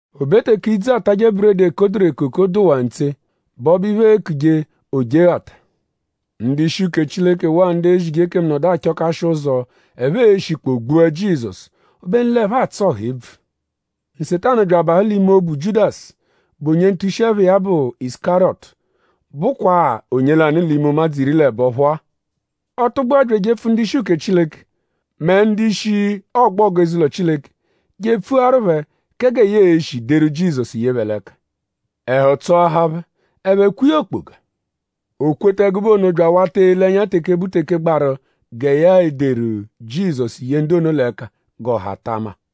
O be teke idzu, aatajẹ buredi, ekoduru ekoko dụwaa ntse, bụ ọbo-iphe, eekuje Ojeghata; ndu-ishi uke Chileke waa ndu ezije ekemu nọdu achọkashi ụzo, ẹphe e-shikpọo gbua Jizọsu; obenu l'ẹphe atsụ ọha ebvu. Nsetanu bya abahụ l'ime obu Jiudasu, bụ onye ntushi-ẹpha iya bụ Isukariyọtu, bụkwa-a onye lanụ l'ime ụmadzu iri l'ẹbo phọ-a. Ọ tụgbua bya ejepfu ndu-ishi uke Chileke mẹ ndu-ishi ọgbogu eze-ụlo Chileke je epfuaru phẹ kẹ gẹ ya e-shi deru Jizọsu ye phẹ l'ẹka. Ẹhu tsọahaa phẹ. Ẹphe kwee ya okpoga. O kweta ẹgube ono bya awata ele ẹnya teke bụ teke gbaru gẹ ya e-deru Jizọsu ye ndu ono l'ẹka g'ọha ta ama.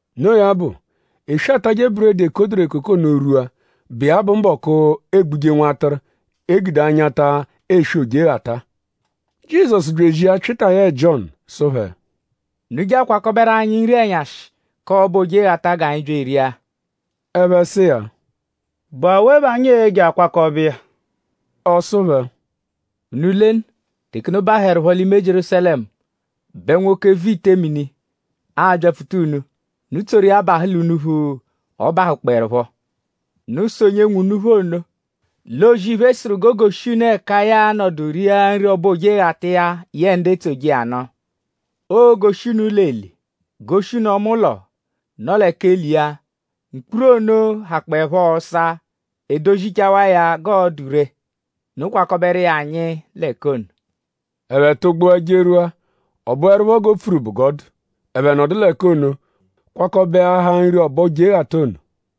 Noo ya bụ; eswe, aatajẹ buredi, ekoduru ekoko ono rwua, bụ iya bụ mbọku, eegbuje nwatụru, e gude anyata eswe Ojeghata. Jizọsu bya ezia Pyịta yẹe Jiọnu sụ phẹ: “Unu je akwakọberu anyi nri-ẹnyashi k'ọbo Ojeghata g'anyi bya eria.” Ẹphe sụ iya: “?Bụ awe bẹ anyi e-je akwakọbe iya?” Ọ sụ phẹ: “Unu lenu; teke unu bahụerupho l'ime Jierúsalẹmu bẹ nwoke, vu ite mini a-byapfuta unu; unu tsoru iya bahụ l'unuphu, ọ bahụkpoerupho. Unu sụ onye nwe unuphu ono lẹ O-zì-iphe sụru g'o goshi unu ẹka ya a-nọdu ria nri ọbo Ojeghata iya yẹe ndu etsoje iya nụ. Oo-goshi unu ụlo-eli; goshi unu ọma ụlo, nọ lẹ k'eli iya; mkpuru ono hakpọepho ọsa; e dozichawa iya g'ọ dụ ree. Unu kwakọberu iya anyi l'ẹka ono.” Ẹphe tụgbua jerwua. Ọ bụerupho g'o pfuru bụ g'ọ dụ. Ẹphe nọdu l'ẹka ono kwakọbeahaa nri ọbo Ojeghata ono.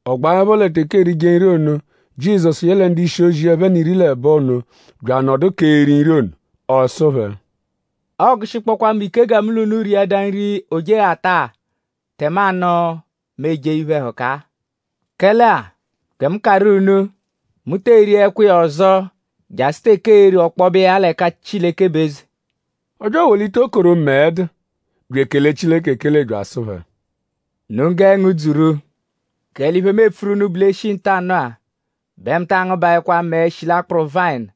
Ọ gbaẹpho lẹ teke erije nri ono; Jizọsu yẹle ndu-ishi-ozi iya ẹphe n'iri l'ẹbo ono bya anọdu k'eri nri ono. Ọ sụ phẹ: “Ọogushikpokwaa mu ike gẹ mu l'unu riadaa nri Ojeghata-a; tẹmanu mu ejee iphe-ẹhuka-a. Kẹle-a; gẹ mu karụ unu; mu tee riẹkwa iya ọzo jasụ teke ee-ri ọkpobe iya l'ẹka Chileke bụ eze.” Ọ bya ewolita okoro, mẹe dụ; bya ekele Chileke ekele bya asụ phẹ: “Unu gẹe ngudzuru! Kẹle iphe, mu epfuru unu bụ l'e -shi ntanụ-a bẹ mu taa ngụbaekwa mẹe, shi l'akpụru vayịnu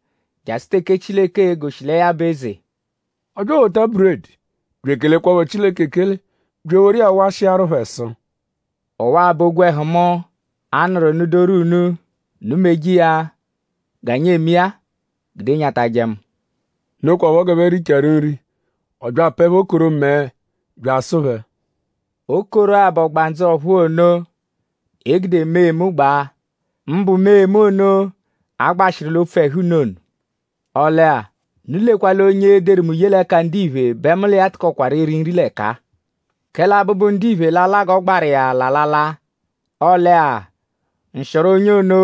jasụ teke Chileke e-goshi lẹ ya bụ eze.” Ọ bya ewota buredi bya ekelekwaphọ Chileke ekele; bya eworu iya washịaru phẹ sụ: “Ọwa-a bụ ogwẹhu mu, a nụru nụ-doru unu. Unu meje iya g'anyi eme iya-a gude nyatajẹ mu.” Nokwaphọ g'ẹphe richaaru nri; ọ bya apẹe phẹ okoro mẹe bya asụ phẹ: “Okoro-a bụ ọgbandzu ọ̀phúú ono, e gude mee mu gbaa; mbụ mee mu ono, a gbashịru l'opfu ẹhu unu ono. “Ọle-a; unu lekwa l'onye e-deru mu ye l'ẹka ndiphe bẹ mu l'iya tụkokwaru eri nri l'ẹka-a. Kẹle Abụbu-Ndiphe l'a-la g'ọ gbaru iya l'alala. Ọle-a; nshịoro onye ono,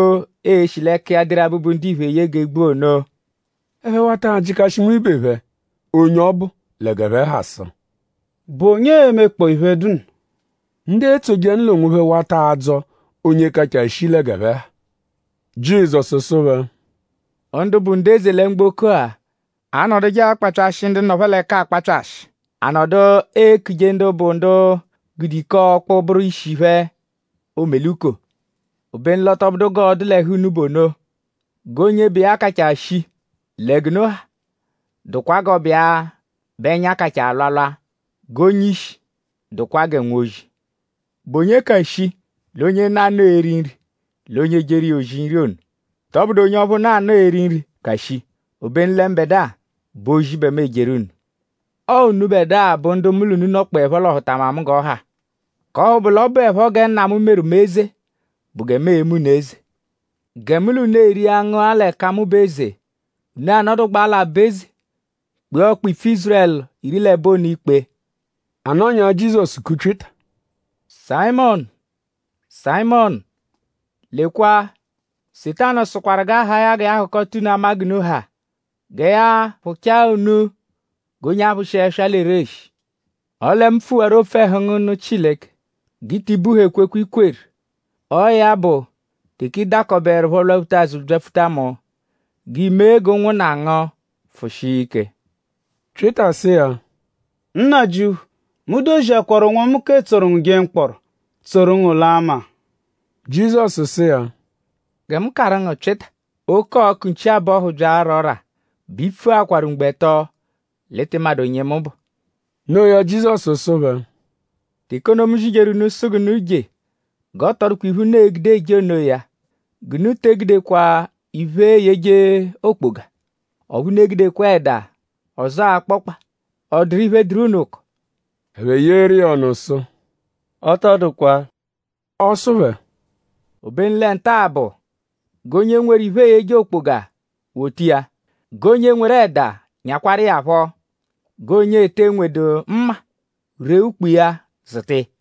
ee-shi l'ẹka iya deru Abụbu-Ndiphe ye g'e gbua ono.” Ẹphe wata ajịkashi nwibe phẹ onye ọ bụ lẹ g'ẹphe ha sụ: “?Bụ onye e-mekpọo iphe, dụ nno?” Ndu etsoje iya nụ l'onwophẹ wata adzọ onye kachaa shii lẹ g'ẹphe ha. Jizọsu sụ phẹ: Ndu bụ ndu eze lẹ mgboko-a anọduje akpapyashị ndu nọ phẹ l'ẹka akpapyashị. A nọdu ekuje ndu bụ ndu gude ike-ọkpu bụru ishi phẹ “omeluko.” Obenu l'ọ tọ bụdu g'ọo-dụ l'ẹhu unu bụ ono. G'onye bụ iya kachaa shii lẹ g'unu ha dụkwa g'ọ bụ iya bẹ ẹnya kachaa alwalwa. G'onye-ishi dụkwa gẹ nwozi. ?Bụ onye ka shii l'onye nọ anọo eri nri l'onye ejeru iya ozi nri ono??Tọbudu onye ọphu nọ anọo eri nri ka shii? Obenu lẹ mbẹdua bụ ozi bẹ mu ejeru unu. “Ọo unubẹdua bụ ndu mu l'unu nọkpoepho l'ọhutama mu g'ọ ha; k'ọphu bụ l'ọ bụepho gẹ Nna mu meru mu eze bụ gẹ mu eme unu eze; gẹ mu l'unu eria ngụa; l'ẹka mu bụ eze; unu anọdugbaa l'aba-eze; kpee ọkpa-ipfu Ízurẹlu iri l'ẹbo ono ikpe.” A nọnyaa; Jizọsu ku Pyịta: “Sayịmonu! Sayịmonu! Lekwa! Nsetanu sụkwaru g'a haa ya gẹ ya hụkota unu ama g'unu ha; gẹ ya phụchaa unu g'onye aphụshi ẹswa l'ereshi. Ọle mu pfuwaru opfu ẹhu ngu nụ Chileke g'i ti buha ekwekwe, i kweru. Ọo ya bụ; teke ị dakọbeerupho lwaphuta azụ byapfuta mu; g'i mee g'ụnwunna ngu pfụshia ike.” Pyịta sụ iya: “Nnajịuphu; mu doziakwaru onwomu k'etsoru ngu jee mkpọro; tsoru ngu laa maa!” Jizọsu sụ iya: “Gẹ mu karụ ngu Pyịta; oke-ọku nchi-abọhu -bya ara ọ́rà bẹ i pfuakwaru mgbo ẹto l'ị tị madụ onye mu bụ.” Noo ya; Jizọsu sụ phẹ: “Teke ono, mu zijeru unu sụ g'unu je; g'ọ tọ dụkwa iphe, unu e-gude eje onoya; g'unu te egudekwa iphe, eeyeje okpoga; ọphu unu egudekwa ẹda; ọzoo akpọkpa;?ọ dụru iphe, dụru unu ụko?” Ẹphe yeeru iya ọnu sụ: “Ọ tọ dụkwa.” Ọ sụ phẹ: “Obenu lẹ nta-a bụ; g'onye nweru iphe, eeyeje okpoga wota iya. G'onye nweru ẹda; nyakwaru iya phọ. G'onye ete nwedu mma; ree ukpo iya zụta iya.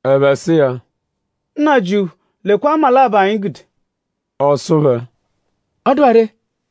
Ẹphe sụ iya: “Nnajịuphu; lekwa mma labọ, anyi gude.” Ọ sụ phẹ: “Ọ dụwaa ree.”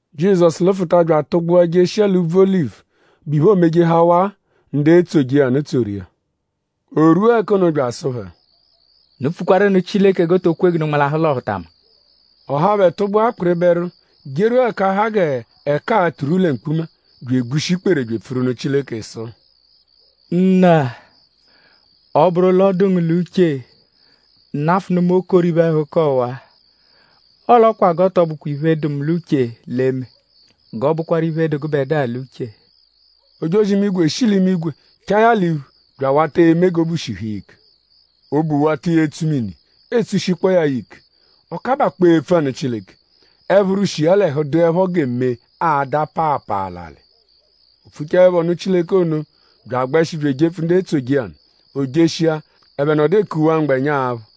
Jizọsu lụfuta bya atụgbua jeshia l'úbvú Olivu, bụ iphe, oomejehawaa. Ndu etsoje iya nụ tsoru iya. O rwua ẹka ono bya asụ phẹ: “Unu pfukwaru nụ Chileke g'o to kwe g'unu nmalahụ l'ọhutama.” Ọ haa phẹ tụgbua kpịriberu jerwua ẹka ha g'ẹka aa-turwu lẹ mkpuma; bya egbushi ikpere bya epfuru nụ Chileke sụ: “Nna; ọ -bụru l'ọ dụ ngu l'uche; nafụnu mu okoro iphe-ẹhuka ọwa-a; ọle ọ kwa g'ọ tọ bụkwa iphe, dụ mu l'uche l'e-me; g'ọ bụkwaru iphe, dụ gụbedua l'uche.” Ojozi-imigwe shi l'imigwe chaa ya l'iphu bya awata eme g'obu shihu iya ike. Obu wata iya etsu mini etsushikpọo ya ya ike. Ọ kabakpọo epfu anụ Chileke. Ẹphuru, shi iya l'ẹhu dụepho gẹ mee ada paapaa l'alị. O pfuchaẹpho nụ Chileke ono bya agbẹshi bya ejepfu ndu etsoje iya nụ. O jeshia; ẹphe nọdu ekuwaa mgbẹnya aphụ.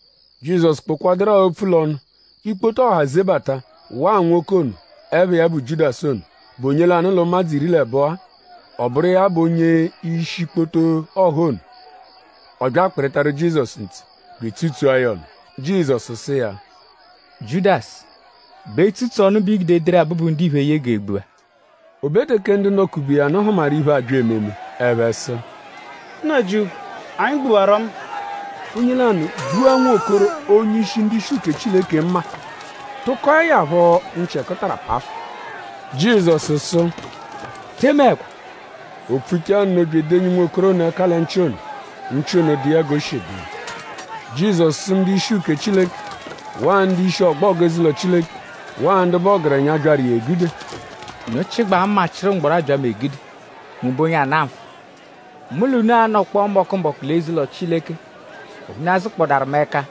Jizọsu kpụkwaduru-a opfu l'ọnu; ikpoto ọha zebata waa nwoke ono, ẹpha iya bụ Jiudasu ono, bụ onye lanụ l'ụmadzu iri l'ẹbo-a. Ọ bụru iya bụ onye-ishi ikpoto ọha ono. Ọ bya akpịritaru Jizọsu ntse bya etsutsua ya ọnu. Jizọsu sụ iya: “Jiudasu;?bụ etsutsu ọnu bẹ i gude ederu Abụbu-Ndiphe eye g'e gbua?” O be teke ndu nọ-kube iya nụ hụmaru iphe, abya ememe; ẹphe sụ: “Nnajịuphu!?Anyi gbuwarọ mma?” Onye lanụ gbua nwokoro onye-ishi ndu-ishi uke Chileke mma; tụkoe ya phọ nchị ẹkutara pafụ. Jizọsu sụ: “Te emeẹkwa.” O pfuchaa nno bya edenyi nwokoro ono ẹka lẹ nchị ono; nchị ono dụ iya g'o shi dụ iya. Jizọsu sụ ndu-ishi uke Chileke; waa ndu-ishi ọgbogu eze-ụlo Chileke; waa ndu bụ ọgerenya, byaru iya egude: “?Unu chịgbaa mma; chịru mgbọro abya mu egude??Mu bụ onye ana nfụ?” “Mu l'unu anọkpoo mbọku-mbọku l'eze-ụlo Chileke; ọphu unu azụkpodaru mu ẹka.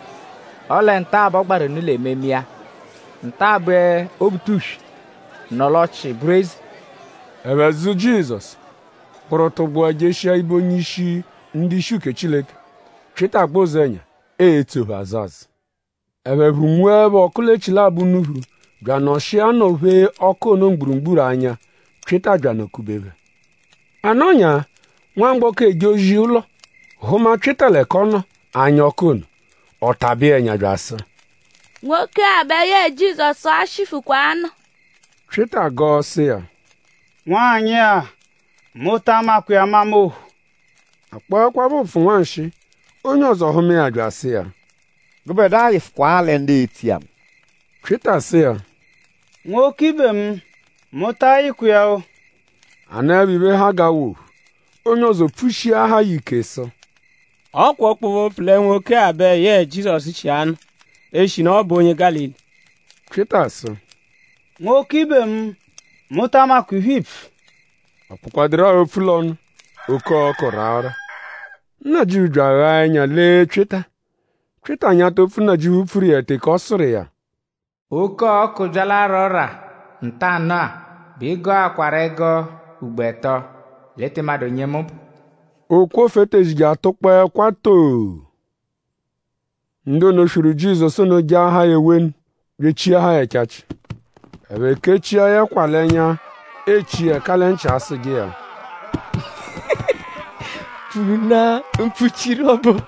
Ọle nta-a bẹ ọ gbaru unu l'ememe iya. Nta-a bẹ Obutuswe nọ l'ọchii bụru eze.” Ẹphe zụ Jizọsu; kpụru tụgbua jeshia ibe onye-ishi ndu-ishi uke Chileke. Pyịta gbẹ ụzenya etso phẹ azụ-azụ. Ẹphe phụ-nwuẹpho ọku l'echilabọ unuphu bya anọshia nọ-phee ọku ono mgburugburu anya. Pyịta bya anọ-kube phẹ. A nọnyaa; nwamgbọko, eje ozi ụlo; hụma Pyịta l'ẹka ọ nọ anya ọku ono. Ọ tabẹ iya ẹnya bya asụ: “Nwoke-a bẹ yẹe Jizọsu-a shifụkwa anọ.” Pyịta gọo sụ iya: “Nwanyị-a; mu ta amakwa iya amama ophu.” A kpọekwapho ụpfu nwanshịi; onye ọzo hụma iya bya asụ iya: “Gụbedua yịfukwaa lẹ ndu etso iya nụ.” Pyịta sụ iya: “Nwoke ibe mu; mu ta ayịkwa iya-o!” A nọepho iphe, ha g'awa ophu; onye ọzo pfushiahaa ya ike sụ: “Ọ kwa ọkpobe-opfu lẹ nwoke-a bẹ yẹe Jizọsu shi anọ; eshinu ọ bụ onye Gálili.” Pyịta sụ: “Nwoke ibe mu; mu ta amakwa iphe, iipfu!” Ọ kpụkwaduru-a opfu l'ọnu; oke-ọku raa ọ́rà. Nnajịuphu bya aghaa ẹnya lee Pyịta. Pyịta nyata opfu, Nnajịuphu pfuru iya teke ọ sụru iya: “Oke-ọku -bya l'ara ọ́rà ntanụ-a bẹ ị gọakwaru ẹgo ugbo ẹto l'ị tị madụ onye mu bụ.” Ọ kwofu etezi je atụkpoo ẹkwa too! Ndu ono, swiru Jizọsu ono jaahaa ya ewenu; bya echiahaa ya ẹchachi. Ẹphe kechia ya ẹkwa l'ẹnya echi iya ẹka lẹ nchị asụje iya: “Pfunaa mpfuchiru ọbu!”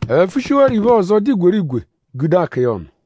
Ẹphe pfushiwarọ iphe ọzo, dụ igwerigwe gude akọ iya ọnu.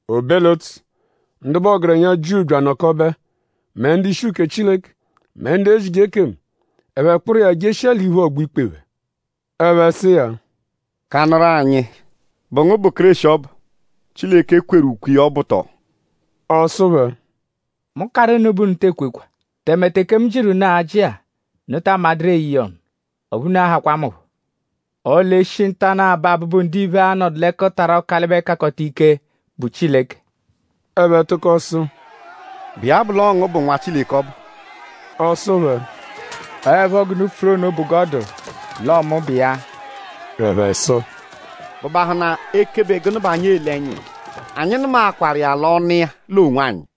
O be l'ụtsu; ndu bụ ọgerenya Jiu bya anọkobe; mẹ ndu-ishi uke Chileke; mẹ ndu ezije ekemu. Ẹphe kpụru iya jeshia l'iphu ọgbo-ikpe phẹ. Ẹphe sụ iya: “Kanụru anyi.?Bụ ngu bụ Kéreshi ọbu, Chileke kweru ukwe iya ọbu tọo?” Ọ sụ phẹ: “Mu -karụ unu bẹ unu te ekwekwa. Tẹme teke mu jịru unu ajị-a; unu taa madụru eye iya ọnu; ọphu unu a-hakwa mu phọ. Ọle e -shi ntanụ-a bẹ Abụbu-Ndiphe a-nọdu l'ẹkutara Ọkalibe-Kakọta-Ike, bụ Chileke.” Ẹphe tụko sụ: “?Bụ iya bụ l'ọo ngu bụ Nwa Chileke ọbu?” Ọ sụ phẹ: “Ọoepho g'unu pfuru ono bụ g'ọ dụ; l'ọo mu bụ iya.” Ẹphe sụ: “?Bụ bahụna ekebe gụnu bẹ anyi ele ẹnya iya? Anyi nụmakwaru iya l'ọnu iya l'onwanyi.”